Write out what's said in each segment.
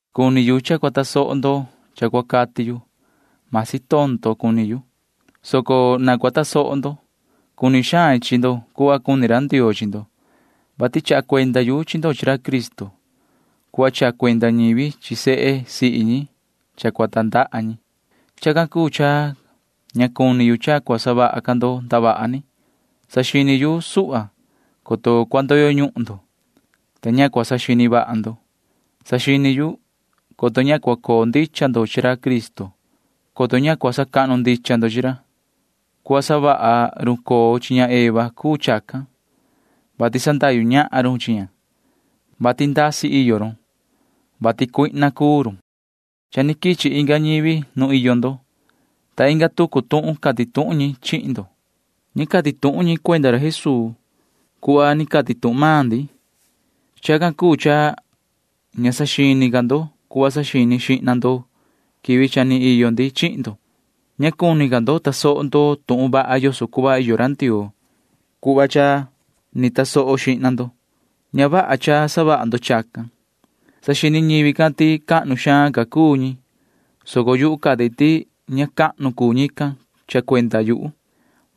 Cuni yu cha cua tasoho ndo cha cua cati yu. Masi tondo cuni yu, soco na cua tasoho ndo. Cuni xain chi ndo cuhva cuni ra Ndioo chi ndo, vati chaha cuenda yu chi ndo chi ra Cristo cuhva chaha cuenda ñivi chi sehe sihi ñi cha cua tandaha ñi. Chacan cuu cha ña cuni yu cha cua savaha ca ndo ndavaha ni. Saxini yu suhva, coto cua ndoyo ñuhun ndo, ta ña cua saxini vaha ndo. Saxini yu, coto ña cua coo ndicha ndo chi ra Cristo, coto ña cua sacahnu ndicha ndo chi ra. Cuhva savaha run coo chi ña Eva cuu chacan, vati sandahyu ñahan run chi ña, vati ndasi iyo run, vati cuihna cuu run. Cha ni quichi inga ñivi nu iyo ndo, ta inga tucu tuhun cati tuhun ñi chihin ndo. Ña cati tuhun ñi cuenda ra Jesuu cuhva ni cati tuhun maan ndi. Chacan cuu cha ña saxini ca ndo cuhva saxini xihna ndo quivi cha ni iyo ndi chihin ndo. Ña cuni ca ndo tasoho ndo tuhun vaha yoso cuhva iyo ra Ndioo cuhva cha ni tasoho xihna ndo. Ña vaha cha savaha ndo chacan. Saxini ñivi can ti cahnu xaan ca cuu ñi, soco yuhu cati ti ña cahnu cuu ñican cha cuenda yuhu.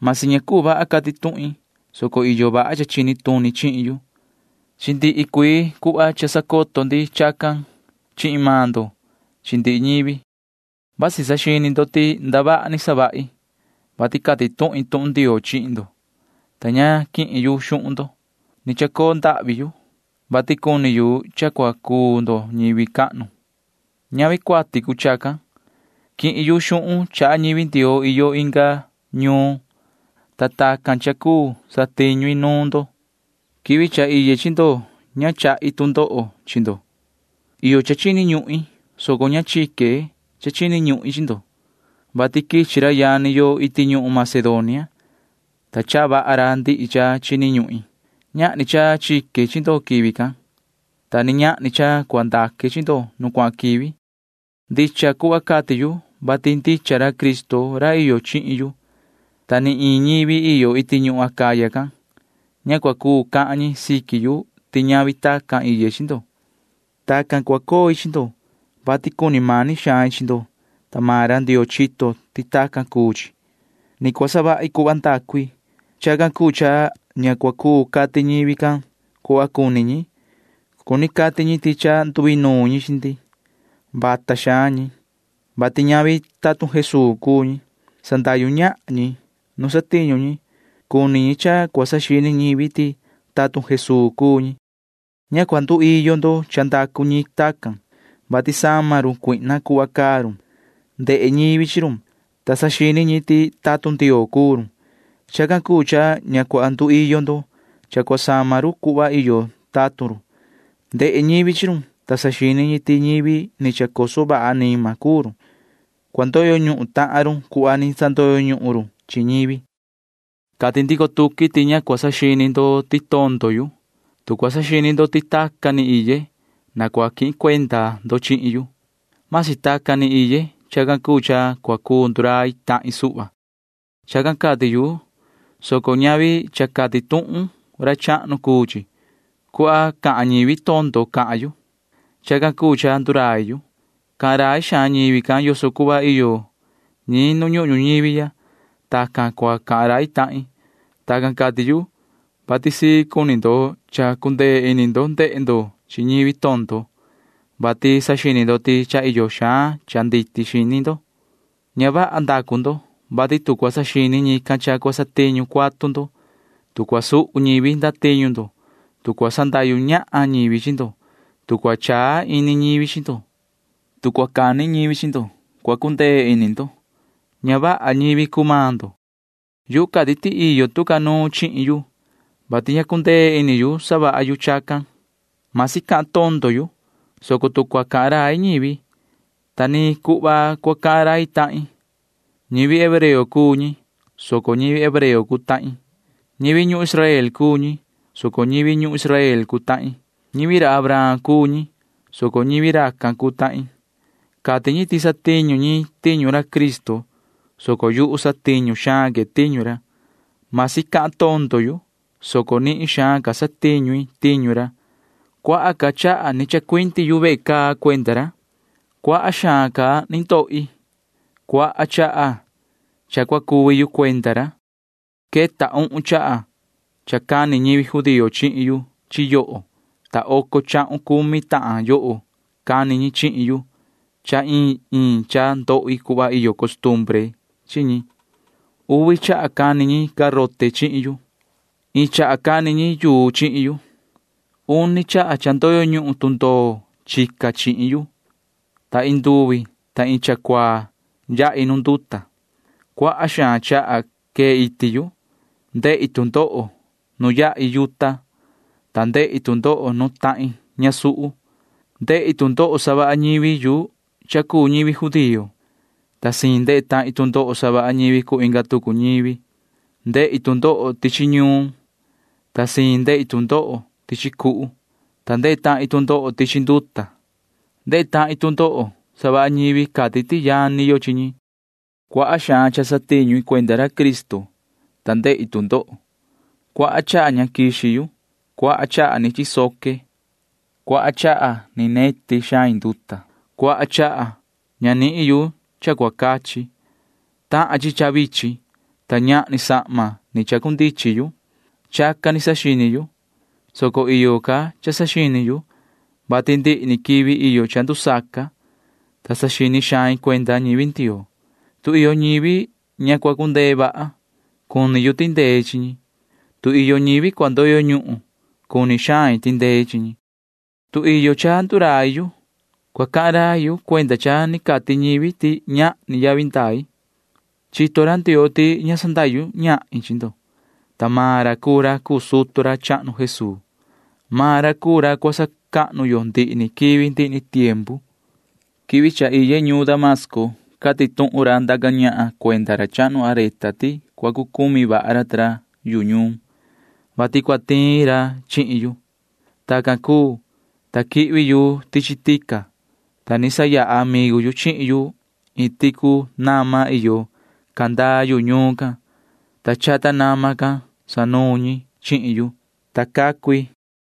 Masi ña cuu vaha cati tuhin, soco iyo vaha cha chini tuni chihin yu. Chi ndihi cuii cuhva cha sacoto ndi chacan chihin maan ndo chi ndihi ñivi. Vasi saxini ndo ti ndavaha ni savahi, vati cati tuhin tuhun Ndioo chihin ndo, ta ña quihin yu xuhun ndo. Ni chacoo ndahvi yu, vati cuni yu cha cua cuu ndo ñivi cahnu. [Ñavi cuati cuu chacan.] Quihin yu xuhun chaha ñivi Ndioo iyo inga ñuun, ta tacan cha cuu satiñu i nuun ndo. Quivi cha iye chi ndo ña chahi tu ndoho chi ndo. Iyo cha chini ñuhin, soco ña chique cha chini ñuhin chi ndo, vati quichi ra yani yo iti ñuhun Macedonia, ta chaha vaha ra ndihi cha chini ñuhin. Ñahni cha chique chi ndo quivi can, ta ni ñahni cha cua ndaque chi ndo nu cuahan quivi. Ndicha cuhva cati yu, vati ndicha ra Cristo ra iyo chihin yu, ta ni iin ñivi iyo iti ñuhun Acaya can―ña cua cuu cahan ñi siqui yu ti ñavi tacan iye chi ndo. Tacan cua coi chi ndo, vati cuni mani xain chi ndo, ta maan ra Ndioo chito ti tacan cuu chi. Ni cua savahi cuhva ndacu i. Chacan cuu cha ña cua cuu cati ñivi can cuhva cuni ñi. Cuni cati ñi ti cha nduinuun ñi chi ndi. Vata xaan ñi, vati ñavi tatun Jesuu cuu ñi. Sandahyu ñahan ñi nu satiñu ñi. Cuni ñi cha cua saxini ñivi ti tatun Jesuu cuu ñi. Ña cua nduiyo ndo cha ndacu ñi tacan, vati sama run Satanaa cuhva caa run. Ndehe ñivi chi run, ta saxini ñi ti tatun Ndioo cuu run. Chacan cuu cha ña cua nduiyo ndo cha cua sama run cuhva iyo tatun run. Ndehe ñivi chi run, ta saxini ñi ti ñivi ni chacoso vaha anima cuu run. Cua ndoyo ñuhun tahan run cuhva ni sandoyo ñuhun run chi ñivi. Cati ndico tuqui ti ña cua saxini ndo ti tondo yu. Tu cua saxini ndo ti tacan ni iye, na cua quihin cuenda ndo chihin yu―masi tacan ni iye. Chacan cuu cha cua cuu ndurai tahin suhva. Chacan cati yu, soco ñavi cha cati tuhun ra chahnu cuu chi. Cuhva cahan ñivi tondo cahan yu. Chacan cuu cha ndurai yu. Cahan rai xaan ñivi can yoso cuhva iyo ñi nu ñuhun ñuñivi. Tacan cua cahan rai tahin. Tacan cati yu, vati sii cuni ndo cha cundee ini ndo ndehe ndo chi ñivi tondo, vati saxini ndo ti cha iyo xaan cha nditi xini ndo. Ña vaha ndacu ndo, vati tu cua sanini ñican cha cua satiñu cuatu ndo, tu cua suhu ñivi ndatiñu ndo, tu cua sandahyu ñahan ñivi chi ndo, tu cua chaa ini ñivi chi ndo, tu cua cani ñivi chi ndo, cua cundee ini ndo. Ña vaha ñivi cuu maan ndo. Yuhu cati ti iyo tu ca nuun chihin yu, vati ña cundee ini yu savaha yu chacan. Masi cahan tondo yu, soco tu cua cahan rai ñivi, ta ni cuhva cua cahan rai tahin. Ñivi hebreo cuu ñi, soco ñivi hebreo cuu tahin. Ñivi ñuhun Israel cuu ñi, soco ñivi ñuhun Israel cuu tahin. Ñivi ra Abraham cuu ñi, soco ñivi racan cuu tahin. Cati ñi ti satiñu ñi tiñu ra Cristo, soco yuhu satiñu xaan que tiñu ra. Masi cahan tondo yu, soco nihin xaan ca satiñu i tiñu ra. Cuaha ca chaha ni chacuindi yu ve caa cuenda ra. Cuaha xaan ca ni ndohi. Cuaha chaha cha cua cuvi yu cuenda ra. Queta uhun chaha cha cani ñivi judío chihin yu chi yoho, ta oco chahun cumi tahan yoho cani ñi chihin yu cha iin iin cha ndohi cuhva iyo costumbre chi ñi. Uvi chaha cani ñi garote chihin yu. Iin chaha cani ñi yuu chihin yu. Uni chaha cha ndoyo ñuhun tundoo chica chihin yu, ta iin nduvi ta iin cha cuaa yahi nuun nduta. Cuaha xaan chaha quee iti yu. Ndehi tu ndoho nu yahi yuta, ta ndehi tu ndoho nu tahin ñasuhu. Ndehi tu ndoho savaha ñivi yu cha cuu ñivi judío, ta siin ndehe tahin tu ndoho savaha ñivi cuu inga tucu ñivi. Ndehi tu ndoho tichi ñuun, ta siin ndehi tu ndoho tichi cuhu, ta ndehe tahin tu ndoho tichi nduta. Ndehe tahin tu ndoho savaha ñivi cati ti yani yo chi ñi. Cuaha xaan cha satiñu i cuenda ra Cristo, ta ndehi tu ndoho. Cuaha chaha ña quixi yu. Cuaha chaha ni chisoque. Cuaha chaha ni neti xain nduta. Cuaha chaha ña nihin yu cha cua cachi. Tahan chi cha vichin, ta ñahni sahma ni cundichin yu. Chacan ni saxini yu, soco iyo ca cha saxini yu, vati ndihi ni quivi iyo cha ndusaca, ta saxini xain cuenda ñivi Ndioo. Tu iyo ñivi ña cua cundee vaha, cuni yu tindei chi ñi. Tu iyo ñivi cua ndoyo ñuhun, cuni xain tindei chi ñi. Tu iyo cha cua ndurai yu, cua cahan rai yu cuenda cha ni cati ñivi ti ñahni yavi ndai. Chito ra Ndioo ti ña sandahyu ñahin chi ndo, ta maan ra cuu ra cuu sutu ra chahnu Jesuu. Maan ra cuu ra cua sacahnu yo ndihi ni quivi ndihi ni tiempu. Quivi cha iye ñuun Damasco cati tuhun ra ndaca ñahan cuenda ra chahnu Areta ti cua cu cumi vaha ra ta ra yu ñuun, vati cua tiin ra chihin yu. Tacan cuu, ta quihvi yu tichi tica, ta ni sayaha amigu yu chihin yu iin ticu nama iyo candaa yu ñuun can, ta chata nama can sanuun ñi chihin yu, ta cacu i.